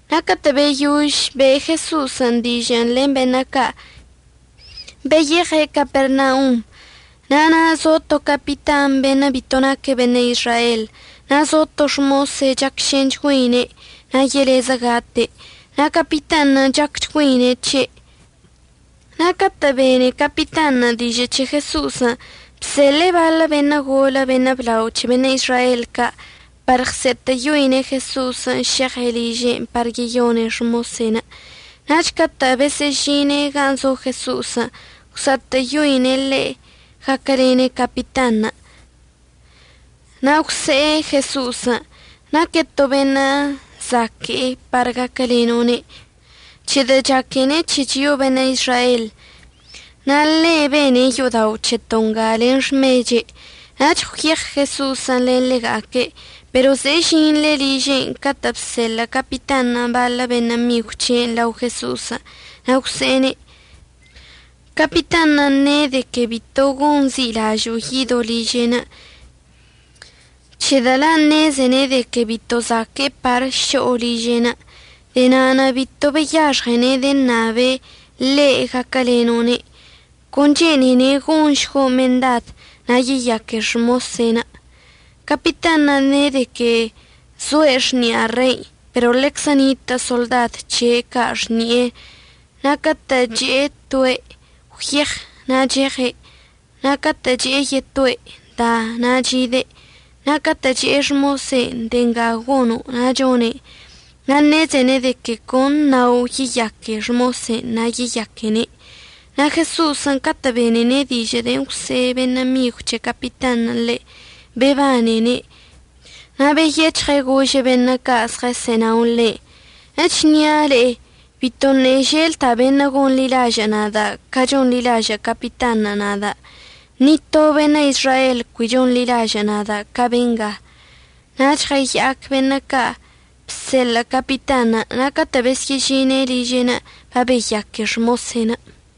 Na' catə' beyož be' Jeso'osən' dižə'ən len beṉə' ca', beyeɉe' Capernaunṉə'. Na' zo to capitan beṉə' bito naque' beṉə' Izrael, na' zo to xmose' chacšenchgüeine' na' yelezə gate'. Na' capitanṉə' chacchgüeine' c̱he'. Na' catə' bene capitanṉə' dižə' c̱he Jeso'osən', bseḻe'e baḻə beṉə' golə beṉə' blao c̱he beṉə' Izrael ca' par ɉse'etə'əyoine' Jeso'osən' šeɉe' liže'enə' par yeyone' xmosen'. Nach catə' besə'əžine' gan' zo Jeso'osən' gwsa'atə'əyoine' ḻe' gaquəlene' capitanṉə', na' gwse'e Jeso'osən': ―Naque' to beṉə' zaque'e par gaquəleno'one', c̱hedə' chaquene' c̱he chio'o beṉə' Izrael. Na' ḻe' bene' yo'odao' c̱heto' nga len xmeche'. Nach gwyeɉ Jeso'osən' len ḻega'aque'. Pero ze'e yesə'əžine' liže'enə' catə' bseḻə' capitanṉə' baḻə beṉə' migw c̱he'enə' lao Jeso'osən', na' gwse'ene': ―Capitanṉə' ne' de que bito gonzi'ilažo'o yido' liže'enə', c̱hedə' la' ṉezene' de que bito zaque'e par šo'o liže'enə'. De'e na'anə' bito beyaxɉene' deṉabene' le' gaquəleno'one'. Con chene'ene' gonšgo' mendadən' na' yeyaque xmose'enə'. Capitanṉə' ne' de que zoe' xni'a rein', pero ḻeczə nitə' soḻdad c̱he' ca' xni'enə'. Na' catə' che'e toe': “Gwyeɉ”, na' cheɉe', na' catə' che'e yetoe': “Da”, na' chide'. Na' catə' che'e xmosen': “De'e nga gono'”, na' chone'en. Na' ṉezene' de que con əṉao' yeyaque xmose'enə' na' yeyaquene'. Na' Jeso'osən' catə' benene' dižə' de'en əgwse' beṉə' migw c̱he capitanṉə' ḻe', bebanene' na' beyec̱hɉe' gože' beṉə' ca' zɉəsə'ənao ḻe': ―Echnia' le'e, bitoṉə' želda' beṉə' gonḻilažə' nada' ca chonḻilažə' capitanṉə' nada'. Ni to beṉə' Izrael cui chonḻilažə' nada' ca benga. Nach ɉəya'ac beṉə' ca' bseḻə' capitanṉə', na' catə' besyə'əžine' liže'enə' babeyaque xmose'enə'.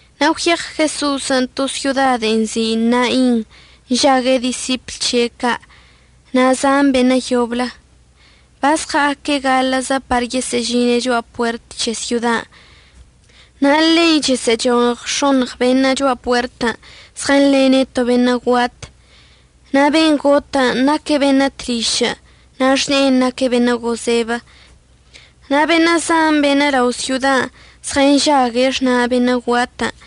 Na' gwyeɉ Jeso'osən' to syoda de'en nzi' Nain, nžague' disipl c̱he' ca' na' zan beṉə' yoblə. Bazɉa'aque' gaḻə'əzə par yesə'əžine' cho'a puert c̱he syodan', na' ḻei chəsə'əchoɉ x̱oṉɉ beṉə' cho'a puertən' zɉənḻene' to beṉə' guat. Na' ben' gotən' naque' beṉə' tlišə', na' xne'en naque' beṉə' gozebə. Na' beṉə' zan beṉə' lao' syodan' zɉənžague' xna' beṉə' guatən'.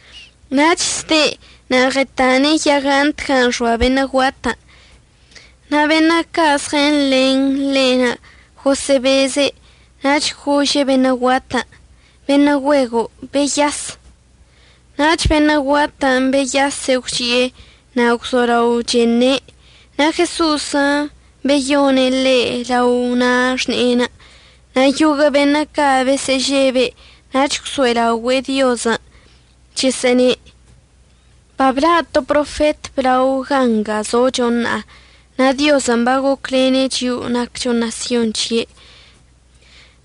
Nach zde' na' ɉtane' yagant gan' xoa beṉə' guatən', na' beṉə' ca' zɉənḻen ḻe'enə' gosə'əbeze'. Nach gože' beṉə' guatən': ―Beṉə' güego', beyas. Nach beṉə' guatən' beyase' gwchi'e na' gwzolao cheṉe'. Na' Jeso'osən' beyone' ḻe' lao na' xne'enə'. Na' yoguə' beṉə' ca' besə'əžebe' nach gwso'elaogüe'e Diozən' chəsə'əne': ―Babla' to profet əblao gan' nga zocho ṉa'a. Na' Diozən' bagocwlene' chio'o naccho ṉasyon c̱he'enə'.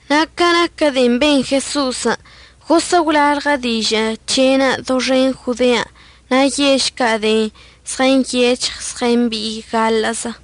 Na' ca naquə de'en ben Jeso'osən' gosə' gwlalɉə dižə' c̱he'enə' doxen Jodean' na' yež ca' de'en zɉənyec̱hɉ zɉəmbi'i gaḻə'əzə.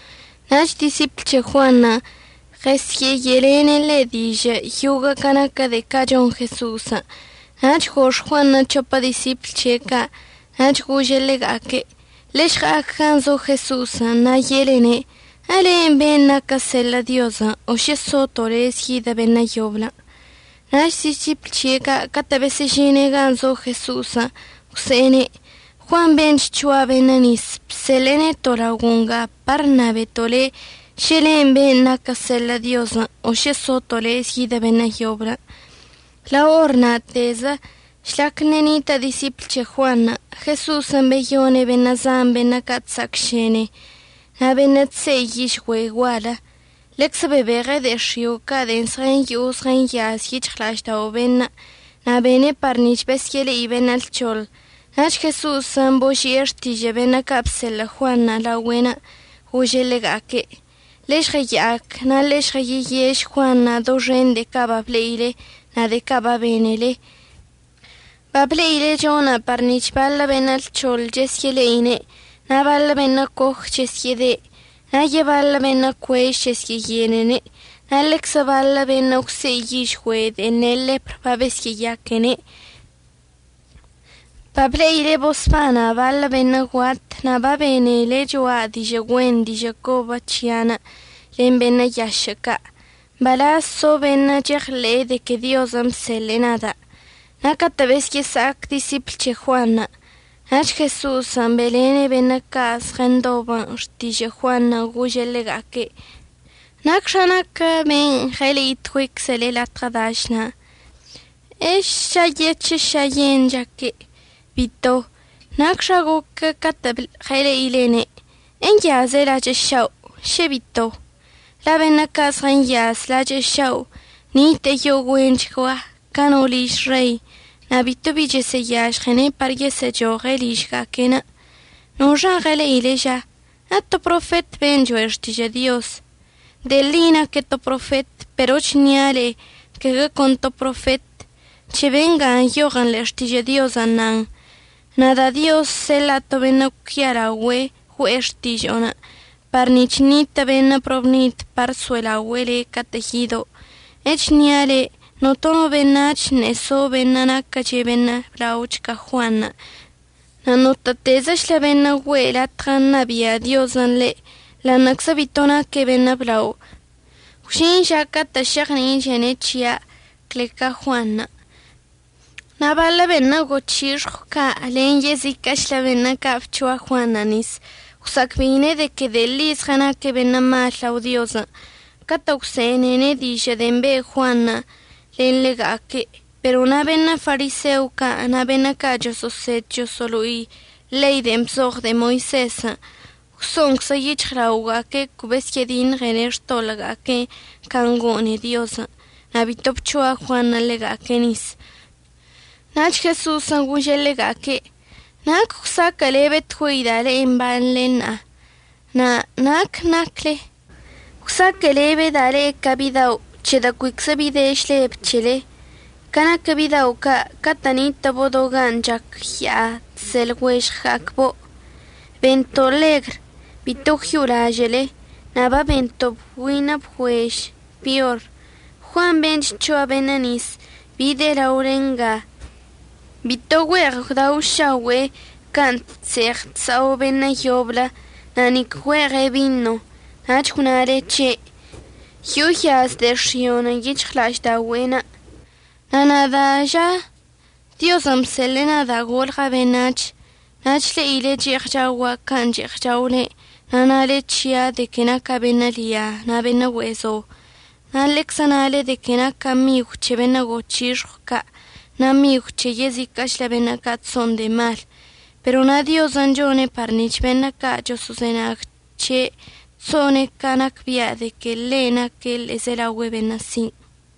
Nach disipl c̱he Juanṉə' ɉəsye'eye'elene' ḻe' dižə' yoguə' ca naquə de'e ca' chon Jeso'osən'. Nach gox Juanṉə' c̱hopə disipl c̱he' ca' nach gože' ḻega'aque': ―Ḻe'e žɉa'ac gan' zo Jeso'osən' na' ye'elene': “¿Elen' ben' naquən əseḻə' Diozən' o šə soto' lez yidə beṉə' yoblən'?” Nach disipl ca' catə' besə'əžine' gan' zo Jeso'osən' gwse'ene': ―Juan ben' chc̱hoa beṉə' nis bseḻe'e neto' laogo' nga par əṉabeto' le' šə len' ben' naquən əseḻə' Diozən' o šə soto' lez yidə beṉə' yoblən'. Lao or na'atezə žlac ṉe'e nitə' disipl c̱he Juanṉə', Jeso'osən' beyone' beṉə' zan beṉə' ca' chsa'acšene na' beṉə' chse'i yižgüe' gual. Ḻeczə bebeje' de'e x̱io' ca' de'en zɉəyo'o zɉəyaz yic̱hɉla'aždao' beṉə', na' bene' par nic̱h besyə'əle'i beṉə' lc̱hoḻ. Nach Jeso'osən' boži'e xtižə' beṉə' ca' bseḻə' Juanṉə' laogüe'enə' gože' ḻega'aque': ―Ḻe'e žɉəya'ac na' ḻe'e žɉəyeyež Juanṉə' doxen de'e ca' bable'ile na' de'e ca' babenele. Bable'ile chona' par nic̱h baḻə beṉə' lc̱hoḻ chesyə'əle'ine', na' baḻə beṉə' coj chesyə'əde', na' yebaḻə beṉə' cuež chesyə'əyenene', na' ḻeczə baḻə beṉə' gwse'i yižgüe' de'en ne' ḻepr babesyə'əyaquene'. Bable'ile bosbana' baḻə beṉə' guat na' babenele cho'a dižə' güen dižə' cobə c̱hia'anə' len beṉə' yašə' ca'. Mbalaz zo beṉə' cheɉḻe'e de que Diozən' bseḻe'e nada'. Na' catə' besyə'əsa'ac disipl c̱he Juanṉə' nach Jeso'osən' be'elene' beṉə' ca' zɉəndobən' xtižə' Juanṉə', gože' ḻega'aque': ―¿Nacxa naquə ben' ɉəle'itgüeiczele latɉə dašən'? ¿Ešayec̱hə šayen chaque'? Bito. ¿Nacxan' goque' catə' ɉəle'ilene'? ¿Enyaze' lachə' šao'? ¿əšə bito? la' beṉə' ca' zɉənyaz lachə' šao' nite'e yo'o güenchgua ca no liž rei, na' bito bi chesə'əyažɉene' par yesə'əchoɉe' ližga'aque'enə'. ¿Noxan' ɉəle'ilen' ža? ¿Eto profet ben' cho'e xtižə' Diozən'? De'e ḻi naque' to profet. Pero əchnia' le'e caguə con to profetən'. C̱he bengan' nyoɉən ḻe'e Xtižə' Diozən' nan: Nada' Dioz əseḻa'a to beṉə' cuialaogüe' güe'e xtižo'onə', par nic̱h ṉitə' beṉə' probnid par əso'elaogüe'e le' catə'ən yido'. Echnia' le'e, notono beṉac̱h ṉe'e so beṉə' naquəch beṉə' blaoch ca Juanṉə'. Na' notə'ətezəchlə beṉə' güe'e latɉə ṉabia' Diozən' ḻe', ḻa'aṉə'əczə bito naque' beṉə' blao gwžin ža catə' šeɉni'ichene' c̱hia' clezə ca Juanṉə'. Na' baḻə beṉə' goc̱hixɉw ca' na' len yeziquə'əchlə beṉə' ca' bc̱hoa Juanṉə' nis, gwsa'acbe'ine' de que de'e ḻi zɉənaque' beṉə' mal lao Diozən' catə' gwse'enene' dižə' de'en be' Juanṉə' len ḻega'aque'. Pero na' beṉə' fariseo ca' na' beṉə' ca' choso'osed choso'olo'i ḻei de'en bzoɉ de'e Moisezən' gwso'onczə yic̱hɉlaoga'aque' cui besyə'ədiṉɉene' xtoḻə'əga'aque'enə' can' gone'e Diozən' na' bito bc̱hoa Juanṉə' ḻega'aque' nis. Nach Jeso'osən' gože' ḻega'aque': ―¿Nac əgwsaquə'əlebetgüeida' le'e mbanḻe ṉa'a? na' ¿nac nacle? Egwsaquə'əlebeda' le'e ca bidao' c̱hedə' cuiczə bi de žleb c̱hele. Ca naquə bidao' ca' catə' nitə'əbo' do gan' chac ya'a chse' lɉuežɉga'acbo': “Bento' ḻegr, bito gwyo'olažə'əle, na' babento' bgüine bgüež, peor.” Juan ben' chc̱hoa beṉə' nis bide' laole nga. Bito güe'eɉ gwdaošaogüe'e can' chse'eɉ chsa'o beṉə' yoblə, na' nic güe'eɉe' bino. Nach gwnale c̱he': “Yo'o yaz de'e x̱i'onə' yic̱hɉla'aždaogüe'enə'.” Na' nada' ža, Diozən' bseḻe'e nada' golɉa' beṉac̱h, na' chle'ile che'eɉ chaogua' can' che'eɉ chaole, na' nale c̱hia' de que naca' beṉə' lia na' beṉə' güe'e zo. Na' ḻeczə nale de que naca' migw c̱he beṉə' goc̱hixɉw ca' na' migw c̱he yeziquə'əchlə beṉə' ca' chso'on de'e mal. Pero na' Diozən' chone' par nic̱h beṉə' ca' choso'ozenag c̱he' chso'one' ca nacbia' de que ḻe' naque' ḻe'ezelaogüe beṉə' sin'.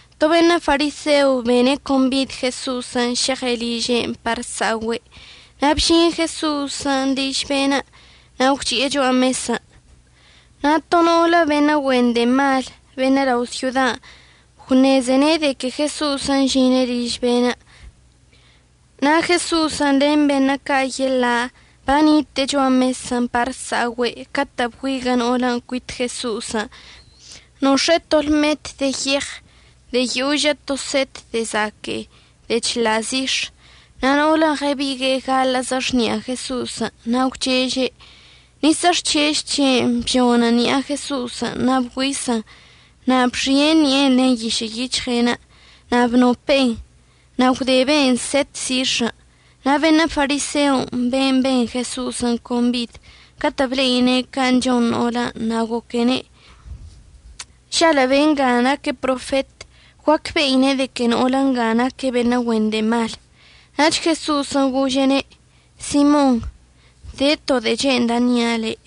To beṉə' fariseo bene' combid Jeso'osən' šeɉe' liže'enə' par əsa'ogüe'. Na' bžin Jeso'osən' liž be'enə' na' gwchi'e cho'a mesən'. Na' to no'olə beṉə' güen de'e mal beṉə' lao' syodan' gwṉezene' de que Jeso'osən' əžine' liž be'enə'. Na' Jeso'osən' len beṉə' ca' yeḻa' banite'e cho'a mesən' par əsa'ogüe' catə' bgüiguə' no'olən' cuit Jeso'osən' nox̱e'e to lmet de yeɉ de'e yožə to set de'e zaque'e de'e chḻa' zix̱. Na' no'olən' ɉəbigue'e gaḻə'əzə xni'a Jeso'osən', na' gwcheže'. Nis əxchež c̱he'enə' bžonən ṉi'a Jeso'osən' na' bgüisən. Na' bxie' ṉi'enə' len yišə' yic̱hɉe'enə', na' bnope'en, na' gwdebe'en set zix̱ən'. Na' beṉə' fariseon' ben' ben Jeso'osən' combid, catə' ble'ine' can' chon no'olən', na' goquene': ―Žalə' be'enga naque' profet, guacbe'ine' de que no'olə nga naque' beṉə' güen de'e mal. Nach Jeso'osən' gože'ene': ―Simon, de to de'e che'enda' əṉia' le'.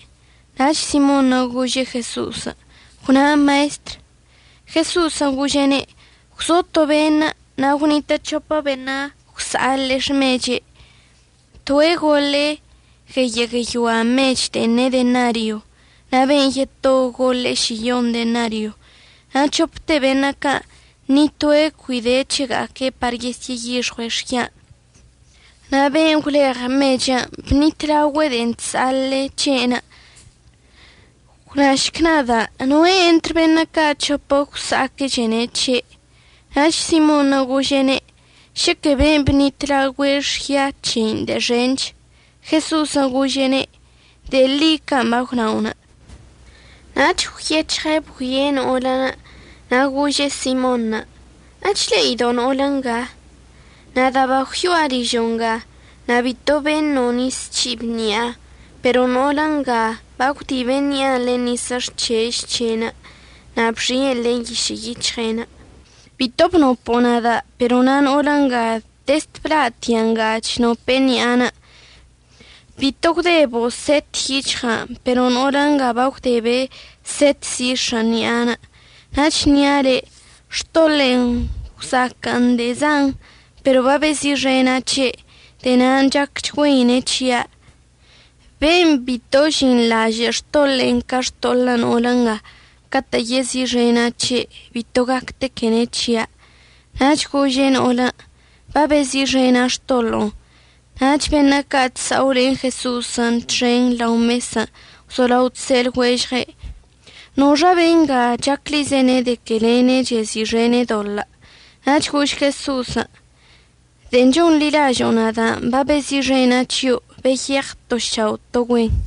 Nach Simonṉə' gože' Jeso'osən': ―Gwnan Maestr. Jeso'osən' gože'ene': ―Gwzo to beṉə', na' gwnitə' c̱hopə beṉə' gwsa'aḻe'e xmeche'. Toe' goḻe'e gueyə' gueyoa mech de'en ne' denario, na' ben' yeto goḻe'e šiyon denario. Na' c̱hopte beṉə' ca' ni toe' cui de c̱hega'aque' par yesyə'əyixɉue' xyan', na' ben' gwleɉ mechən' bṉitlaogüe' de'en chsa'aḻe'e c̱he'enə'. Gwnašc nada', ¿noe' entr beṉə' ca' c̱hopə gwsa'aquechene' c̱he'? Nach Simonṉə' gože'ene': ―Šəquə ben' əbṉitlaogüe' xya c̱hein' de'e xench. Jeso'osən' gože'ene': ―De'e ḻi can' bagwna'onə'. Nach gwyec̱hɉe' bgüie' no'olən' na' gože' Simonṉə': ―¿Echle'ido' no'olə nga? Nada' bagwyo'a ližo' nga, na' bito beṉo' nis c̱hib ṉi'a, pero no'olə nga bagwdibe' ṉi'anə' len nis əxchež c̱he'enə', na' bxi'en len yišə' yic̱hɉe'enə'. Bito bnopo'o nada', pero na' no'olə nga dezd bla'atia' nga chnope'e ṉi'anə'. Bito gwdebo' set yic̱hɉa'anə', pero no'olə nga bagwdebe' set zix̱ən' ṉi'anə'. Na' əchnia' le', xtoḻe'enə' gwsa'aquən de'e zan, pero babezi'ixena' c̱he'. De'e na'anə' chacchgüeine' c̱hia'. Ben' bito əžinḻažə' xtoḻe'enə' ca xtoḻə' no'olə nga, catə' yezi'ixena' c̱he' bito gactequene' c̱hia'. Nach gože' no'olən': ―Babezi'ixena' xtoḻo'onə'. Nach beṉə' ca' chsa'o len Jeso'osən' txen lao mesən' gwzolao chse' lɉuežɉe': ―¿Noxa benga chaclizene' de que ḻe'enə' chezi'ixene' doḻə'? Nach gož Jeso'osən': ―De'en chonḻilažo'o nada' babezi'ixena' c̱hio'. Beyeɉ to šao' to güen.